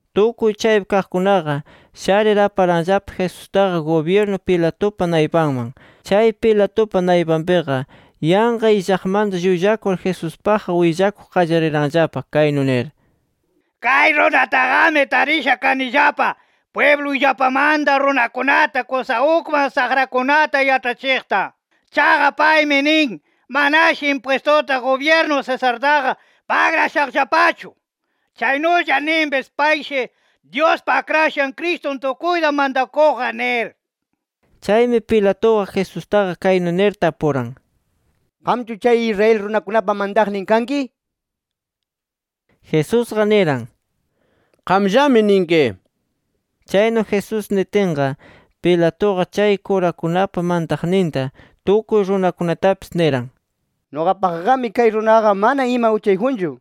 Tukuy chaypi kaqkunaqa, sharir aparanllapa Jesustaqa gubyirnu Pilatupa naypanman. Chay Pilatupa naypanpiqa, yanqa illaqmanta llullakur Jesuspaqqa willakuq qallariranllapa kaynu nir: —Kay runataqami tarisha kanillapa pwibluyllapamanta runakunata kusa ukman saqrakunata yaĉhachiqta. Chaqa, paymi nin manashi impwistuta gubyirnu Cesartaqa pagrashaqllapachu. Chaynulla ninpis payshi Dyuspa Akrashan Cristun tukuyta mantakuqqa nir. Chaymi Pilatuqa Jesustaqa kaynu nir tapuran: —¿Qamchu chay Israel runakunapa mantaqnin kanki? nir. Jesusqa niran: —Qamllami ninki. Chaynu Jesús nitinqa, Pilatuqa chay kurakunapa mantaqninta, tukuy runakunatapis niran: —Nuqapaqqami kay runaqa mana ima uchayjunchu nir.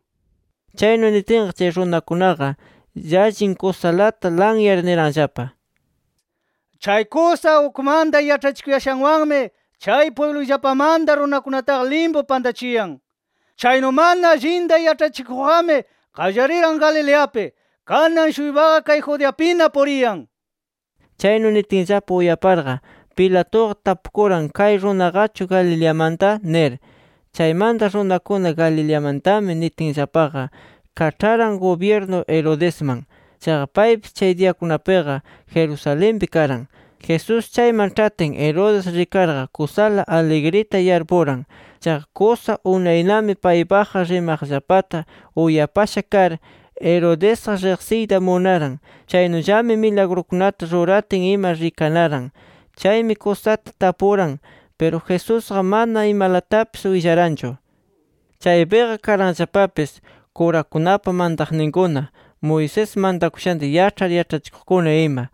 Chaynu nitinqa, chay runakunaqa llallin kusalata lanyar niranllapa: —Chay kusa ukmanta yaĉhachikuyashanwanmi, chay pwibluyllapamanta runakunataqa limpu pantachiyan. Chaynu mana allinta yaĉhachikuqqami qallariran Galileapi. Kanan-shuypaqa kay Judeapina puriyan nir. Chaynu nitinllapa uyaparqa, Pilatuqa tapukuran ¿kay runaqachu Galileamanta? nir. Chaymanta runakuna, Galileamantami nitinllapaqa, kaĉharan gubyirnu Herodesman. Chaqa, paypis chay diyakunapiqa Jerusalenpi karan. Jesús chayman ĉhatin, Herodes rikarqa kusala aligrita yarpuran. Chaqa kusa unaynami paypaqqa rimaqllapata uyapasha kar, Herodesqa riqsiyta munaran. Chaynullami milagrukunata ruratin ima rikanaran. Chaymi kusata tapuran. Piru, Jesusqa mana imalatapis willaranchu. Chaypiqa karanllapapis kurakunapa mantaqninkuna, Moisés mantakushanta yaĉhar yaĉhachikuqkuna ima.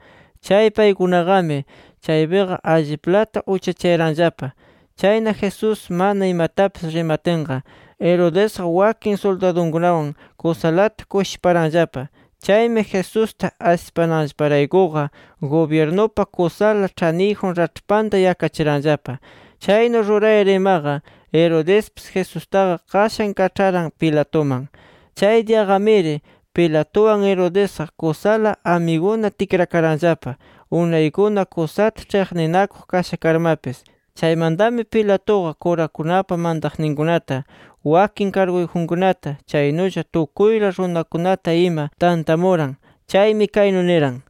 Chay paykunaqami chaypiqa alliplata uchachayaranllapa. Chayna, Jesús mana imatapis rimatinqa, Herodesqa wakin suldadukunawan kusalata kushiparanllapa. Chaymi Jesusta asipananllaparaykuqa, gubyirnupa kusala ĉhaniyjun raĉhpanta yakachiranllapa. Chaynu rurayar imaqa, Herodespis Jesustaqa qashan kaĉharan Pilatuman. Chay diyaqamiri Pilatuwan Herodesqa kusala amiguna tikrakaranllapa, unaykuna kusata ĉhiqninakuq kasha karmapis. Chaymantami Pilatuqa kurakunapa mantaqninkunata, wakin karguyjunkunata, chaynulla tukuyla runakunata ima tantamuran. Chaymi kaynu niran: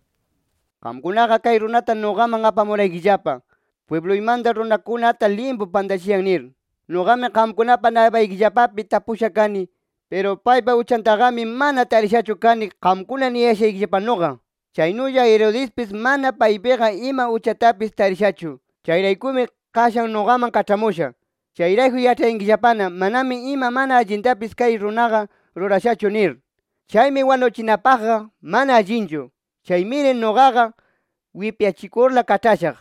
—Qamkunaqa kay runata nuqaman apamuraykillapa, ‘Pwibluymanta runakunata limpu pantachiyan’ nir. Nuqami qamkunapa naypaykillapapi tapusha kani. Piru paypa uchantaqami mana tarishachu kani qamkuna niyashaykillapanuqa. Chaynulla Herodespis mana paypiqa ima uchatapis tarishachu. Chayraykumi qashan nuqaman kaĉhamusha. Chayrayku yaĉhayankillapana, manami ima mana allintapis kay runaqa rurashachu nir. Chaymi wanuchinapaqqa mana allinchu. Chaymiri nuqaqa wipyachikurla kaĉhashaq.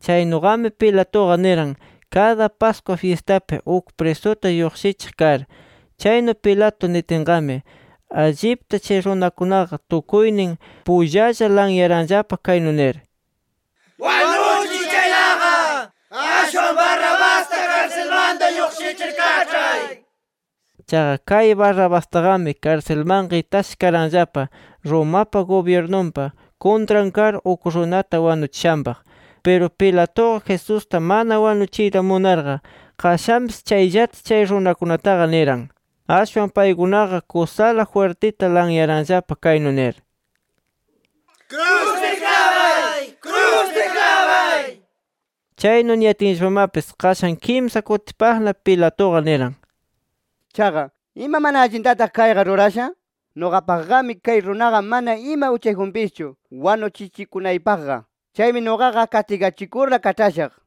[Chaynuqami Pilatuqa niran, kada Pascua fyistapi uk prisuta lluqshichiq kar]. Chaynu Pilato nitinqami, allipta chay runakunaqa tukuynin pullalla lanyaranllapa kaynu nir: —¡Wanuchiy chaytaqa! ¡Ashwan Barrabasta karsilmanta lluqshichir kaĉhay! nir. Chaqa, kay Barrabastaqami karsilmanqa itasha karanllapa, Romapa gubyirnunpa kuntran kar uk runata wanuchishanpaq. Piru Pilatuqa, Jesusta mana wanuchiyta munarqa, qashanpis chayllata chay runakunataqa niran. Ashwan paykunaqa kusala jwirtita lanyaranllapa kaynu nir: —¡Kruspi klabay! ¡Kruspi klabay! nir. Chaynu niyatinllapamapis, qashan kimsa kutipaqna Pilatuqa niran: —Chaqa ¿ima mana allintataq kayqa rurasha? Nuqapaqqami kay runaqa mana ima uchayjunpischu wanuchichikunaypaqqa. Chaymi nuqaqa kastigachikurla kaĉhashaq.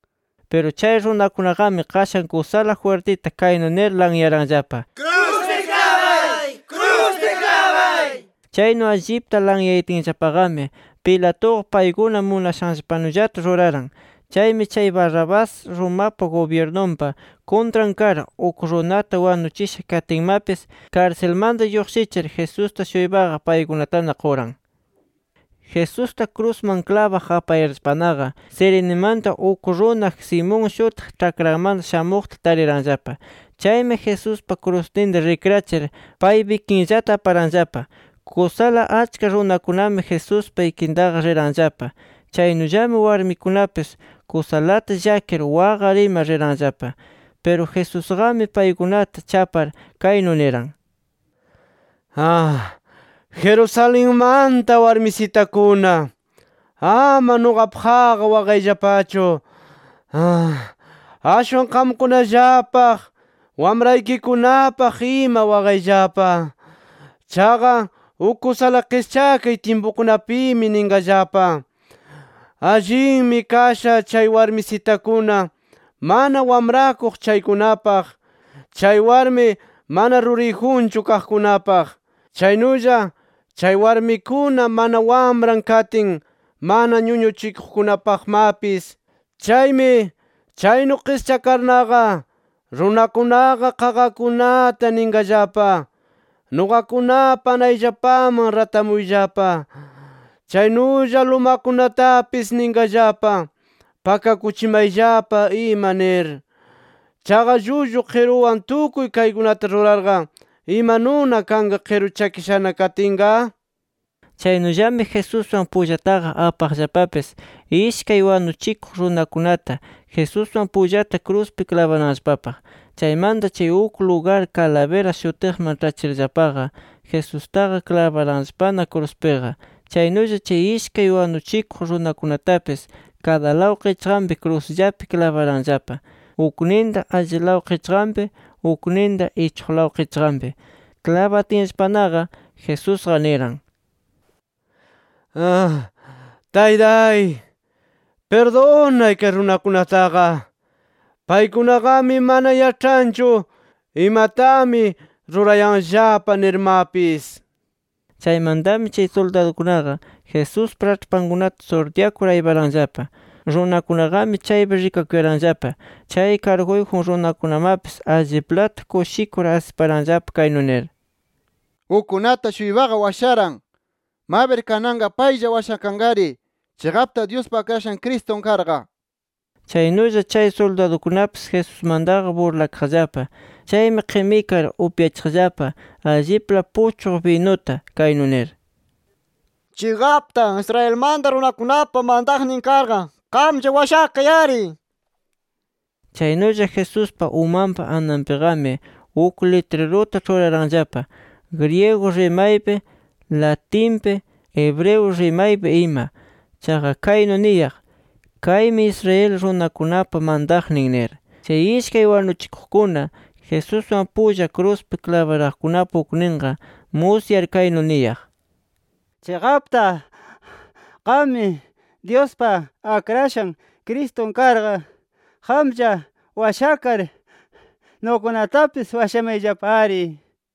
Piru chay runakunaqami qashan kusala jwirtita kaynu nir lanyaranllapa: —¡Kruspi klabay! nir. Chaynu allipta lanyayatinllapaqami, Pilatuqa, paykuna munashanllapanullata ruraran. Chaymi chay Barrabás, Romapa gubyirnunpa kuntran kar uk runata wanuchisha katinmapis, karsilmanta lluqshichir, Jesusta-shuypaqa paykunatana quran. Jesusta krusman klabaq apayarllapanaqa, Cirenemanta uk runa Simón shutiq, ĉhakranmanta shamuqta tariranllapa. Chaymi Jesuspa krusninta rikrachir, paypa ikinllata aparanllapa. Kusala achka runakunami Jesuspa ikintaqa riranllapa. Chaynullami warmikunapis kusalata llakir, waqar ima riranllapa. Piru Jesusqami paykunata chapar kaynu niran: “Jerusalenmanta warmisitakuna, ama nuqapaqqa waqayllapachu. Ashwan qamkunallapaq, wamraykikunapaq ima waqayllapa. Chaqa uk kusala qischakay tyimpukunapimi ninqallapa: ‘Allinmi kasha chay warmisitakuna mana wamrakuq chaykunapaq, chay warmi mana ruriyjunchu kaqkunapaq, chaynulla chay warmikuna mana wamran katin mana ñuñuchikuqkunapaqmapis’ nir. Chaymi, chaynu qischakarnaqa runakunaqa qaqakunata ninqallapa: ‘¡Nuqakunapa anayllapaman ratamuyllapa!’ Chaynulla lumakunatapis ninqallapa: ‘Pakakuchimayllapa ima’ nir. Chaqa llullu qiruwan tukuy kaykunata rurarqa, ¿imanuna kanqa qiru chakishana katinqa?” Chaynullami Jesuswan pullataqa apaqllapapis ishkay wanuchikuq runakunata Jesuswan pullata kruspi klabananllapapaq. Chaymanta chay uk lugar Calavera shutiqman ĉhachirllapaqa, Jesustaqa klabaranllapana kruspiqa. Chaynulla chay ishkay wanuchikuq runakunatapis kadalaw qichqanpi krusllapi klabaranllapa. Ukninta allilaw qichqanpi, ukninta ichuqlaw qichqanpi. [Klabatinllapanaqa Jesusqa niran: “Taytay, pirdunay kay runakunataqa. Paykunaqami mana yaĉhanchu imatami rurayanllapa nirmapis”.] Chaymantami chay suldadukunaqa Jesuspa raĉhpankunata surtyakur ayparanllapa. Runakunaqami chaypi rikakuyaranllapa, chay karguyjun runakunamapis alliplata kushikur asiparanllapa kaynu nir: —Ukkunata-shuypaqa washaran. Mabir kananqa paylla washakanqari, chiqapta Dyuspa Akrashan Cristun karqa. Chaynulla chay suldadukunapis Jesusmantaqa burlakaqllapa. Chaymi qimikar upyachiqllapa allipla puchqu binuta, kaynu nir: —¡Chiqapta, Israelmanta runakunapa mantaqnin karqa, qamlla washakay-ari! nir. Chaynulla, Jesuspa umanpa ananpiqami uk litriruta ĉhuraranllapa [griego rimaypi, latinpi, hebreo rimaypi ima] Chaqa kaynu niyaq: “KAYMI ISRAEL RUNAKUNAPA MANTAQNIN” nir. Chay ishkay wanuchikuqkuna Jesuswan pulla kruspi klabaraqkunapa ukninqa, musyar kaynu niyaq: —¡Chiqapta qam Dyuspa Akrashan Cristun karqa, qamlla washakar, nuqakunatapis washamayllapari! nir.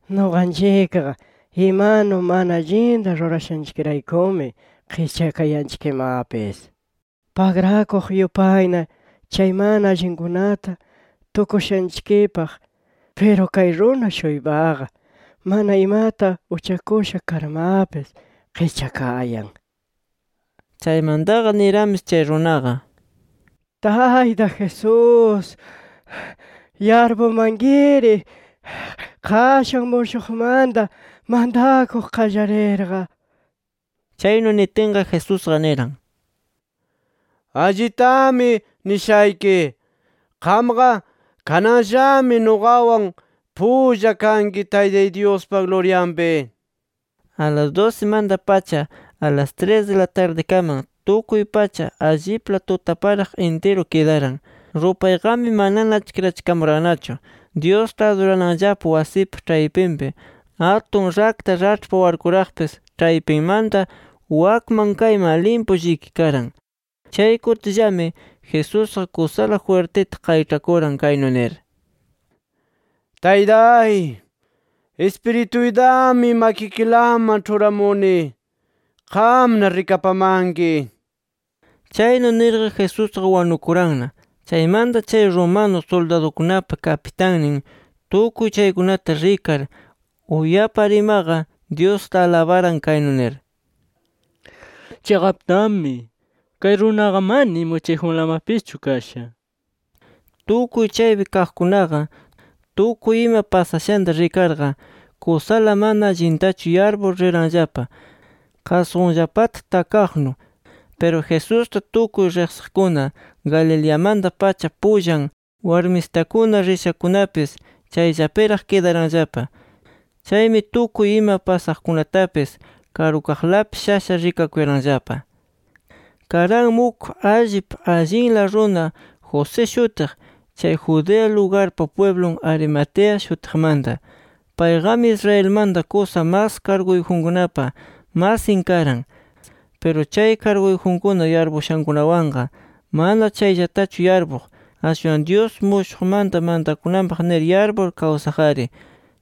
Nuqanchikqa imanu mana allinta rurashanchikraykumi qischakayanchikmapis, pagrakuq yupayna, chay mana allinkunata tukushanchikpaq. Piru kay runa-shuypaqa mana imata uchakusha karmapis, qischakayan. Chaymantaqa niranpis chay runaqa: —Tayta Jesús, yarpumankiri qashan mushuqmanta mantakuq qallarirqa. Chaynu nitinqa, Jesusqa niran: —Allitami nishayki: Qamqa kananllami nuqawan pulla kanki Taytay Dyuspa luryanpi nir. A las dusimanta-pacha alas tris di la tardikaman tukuy pacha allipla tutaparaq intiru kidaran. Rupayqami manana achkirachikamurannachu. Dyusta adurananllapa wasipa ĉhaypinpi atun rakta raĉhpa warkuraqpis ĉhaypimanta wakman kayman limpu llikikaran. Chay kutillami, Jesusqa kusala jwirtita qayĉhakuran kaynu nir: “¡Taytay, ispirituytami makikilaman ĉhuramuni! ¡Qamna rikapamanki!” Chaynu nirqa Jesusqa wanukuranna. Chaymanta chay romano suldadukunapa kapitannin, tukuy chaykunata rikar uyapar imaqa, Dyusta alabaran, kaynu nir: —Chiqaptami kay runaqa mana ima uchayjunlamapischu kasha nir. Tukuy chaypi kaqkunaqa, tukuy ima pasashanta rikarqa, kusala mana allitachu yarpur riranllapa, qasqunllapata takaqnu. Piru, Jesusta tukuy riqsiqkuna, Galileamanta-pacha pullan warmisitakuna rishakunapis, chayllapiraq kidaranllapa. Chaymi tukuy ima pasaqkunatapis karukaqlapi shasha rikakuyaranllapa. Karanmi uk allip allinla runa José shutiq, chay Judea lugarpa pwiblun Arimatea shutiqmanta. Payqami Israelmanta kusa mas karguyjunkunapa masin karan. Piru chay karguyjunkuna yarpushankunawanqa mana chayllatachu yarpuq. Ashwan, Dyus mushuqmanta mantakunanpaq nir yarpur, kawsaq-ari.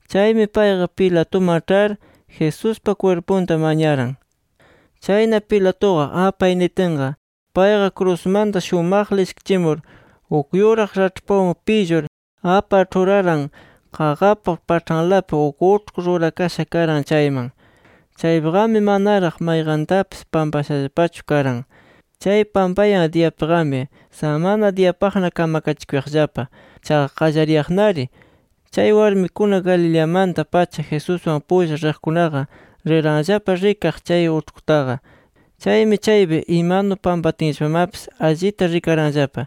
Chaymi payqa Pilatuman ĉhar Jesuspa kwirpunta mañaran. Chayna, Pilatuqa apay nitinqa, payqa krusmanta shumaqla ishkichimur, uk yuraq raĉhpawan pillur apar ĉhuraran qaqapa paĉhanlapi uk uĉhku rurakasha karan chayman. Chaypiqami manaraq mayqantapis pampashallapachu karan. Chay pampayan diyapiqami, samana diyapaqna kamakachikuyaqllapa, chaqa qallariyaqnari. Chay warmikuna Galileamanta-pacha Jesuswan pulla riqkunaqa, riranllapa rikaq chay uĉhkutaqa. Chaymi, chaypi imanu pampatinllapamapis allita rikaranllapa.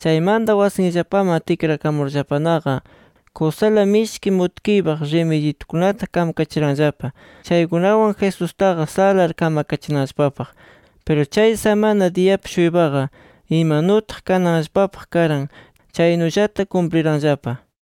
Chaymanta wasinllapaman tikrakamurllapanaqa, kusala mishki mutkiypaq rimidyitukunata kamakachiranllapa, chaykunawan Jesustaqa salar kamakachinanllapapaq. Piru chay samana diyapi-shuypaqa imanutaq kananllapapaq karan, chaynullata kumpliranllapa.